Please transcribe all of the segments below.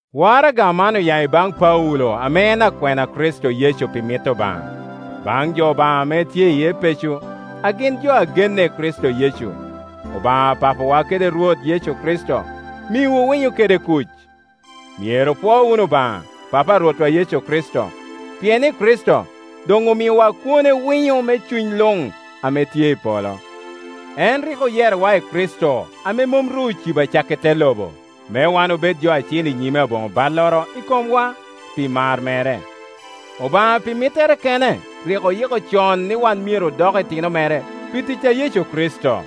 Waraga man oya i baŋ Paulo ame en akwena a Kricito Yecu pi mit Obaŋa. Baŋ jo Obaŋa ame tye i Epeco, a gin jo a genne i Kricito Yecu: Obaŋa Papa wa kede Rwot Yecu Kricito miwu winyo kede kuc. Myero opwo wunu Obaŋa, Papa a Rwotwa Yecu Kricito, pien i Kricito doŋ omiowa kwone winyo me cuny luŋ ame tye i polo. En rik oyerowa i Kricito ame mom ru ocibo acakki te lobo, me wan obed jo acil i nyime aboŋo balloro i komwa, pi mar mere. Obaŋa pi mittere kene rik oyiko con ni wan myero odok itino mere pi tic a Yecu Kricito.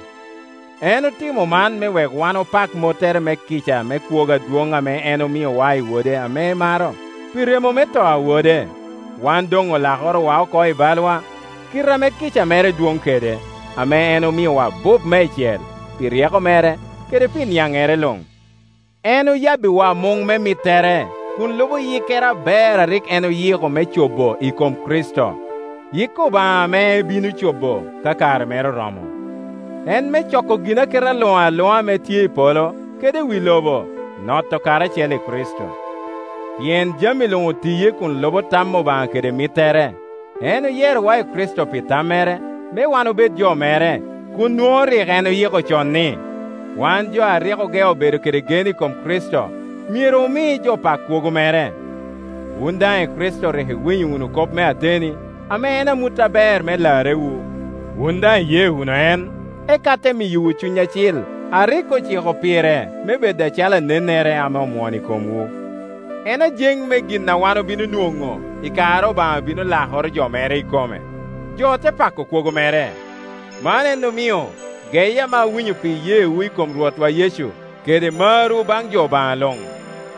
En otimo man me wek wan opak mottere me kica me kwogo adwoŋ a en omiowa i Wode ame emaro. Pi remo me to a Wode, wan doŋ olakorowa oko i balwa, kite ame kica mere dwoŋ kede, ame en omiowa abup meicel. Pi ryeko mere kede pi niaŋŋere luŋ, en oyabbiwa muŋ me mittere, kun lubo yikkere aber a rik en oyiko me co bo i kom Kricito. Yik Obaŋa ame ebino cobo ka kare mere oromo, en me coko ginaketa luŋ aluŋa ame tye i polo kede i wi lobo, noto karacel i Kricito. Pien jami luŋ otiye kun lubo tam Obaŋa kede mittere. En oyerowa i Kricito pi tammere, me wan obed jo mere, kun nwoŋo rik en oyiko con ni, wan jo a rik ogeo bedo kede gen i kom Kricito myero omi jo pak kwogo mere. Wun daŋ i Kricito rik iwinyo wunu kop me ateni, ame en amut aber me larrewu. Wun daŋ iye wunu en, eka ote miyowu Cuny Acil a rik ociko pire me bed acalo anennere ame omwono i komwu. En ajeŋ me gin a wan obino nwoŋo i kare Obaŋa bino lakoro jo mere ikome, jo te pako kwogo mere. Man en omio, geye ame awinyo pi iyeewu i kom Rwotwa Yecu, kede marwu baŋ jo Obaŋa luŋ,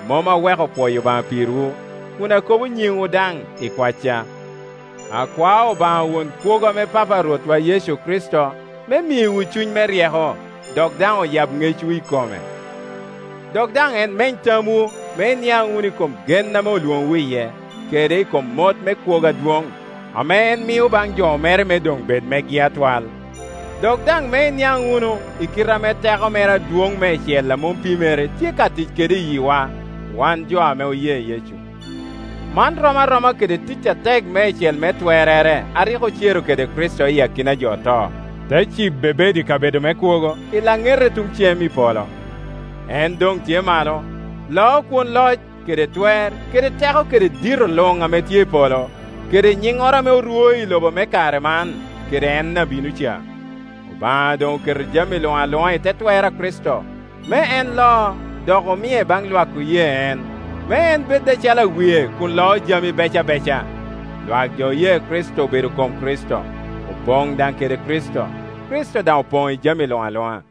mom aweko pwoyo Obaŋa pirwu, kun akobo nyiŋwu daŋ i kwacca. Akwao Obaŋa won kwogo ame papa a Rwotwa Yecu Kricito, me miwu cuny me ryeko, dok daŋ oyab ŋecwu i kome. Dok daŋ en meny tamwu, me iniaŋ wunu i kom gen ame olwoŋowu iye, kede i kom mot me kwogo adwoŋ, ame en mio baŋ jo mere me doŋ bed megi atwal; dok daŋ me iniaŋ wunu i kite ame teko mere adwoŋ meicel a mom pimere tye ka tic kede i yiwa, wan jo ame oye Yecu. Man rom aroma kede tic atek meicel me twerrere a rik ocero kede Kricito i akina a jo oto, te cibe bedo i kabedo me kwogo i laŋete tuŋ cem i polo. En doŋ tye malo, loo kwon loc kede twer kede teko kede dito luŋ ame tye i polo, kede nyiŋŋoro ame orwo i lobo me kare man kede en a bino ca; Obaŋa doŋ oketo jami luŋ aluŋa i te twer a Kricito, me en lo, dok omie baŋ lwak jo oye en, me en bed acalo awie kun loo jami bec abeca. Lwak jo oye Kricito obedo kom Kricito, opoŋ daŋ kede Kricito, Kricito daŋ Opoŋ i jami luŋ aluŋa.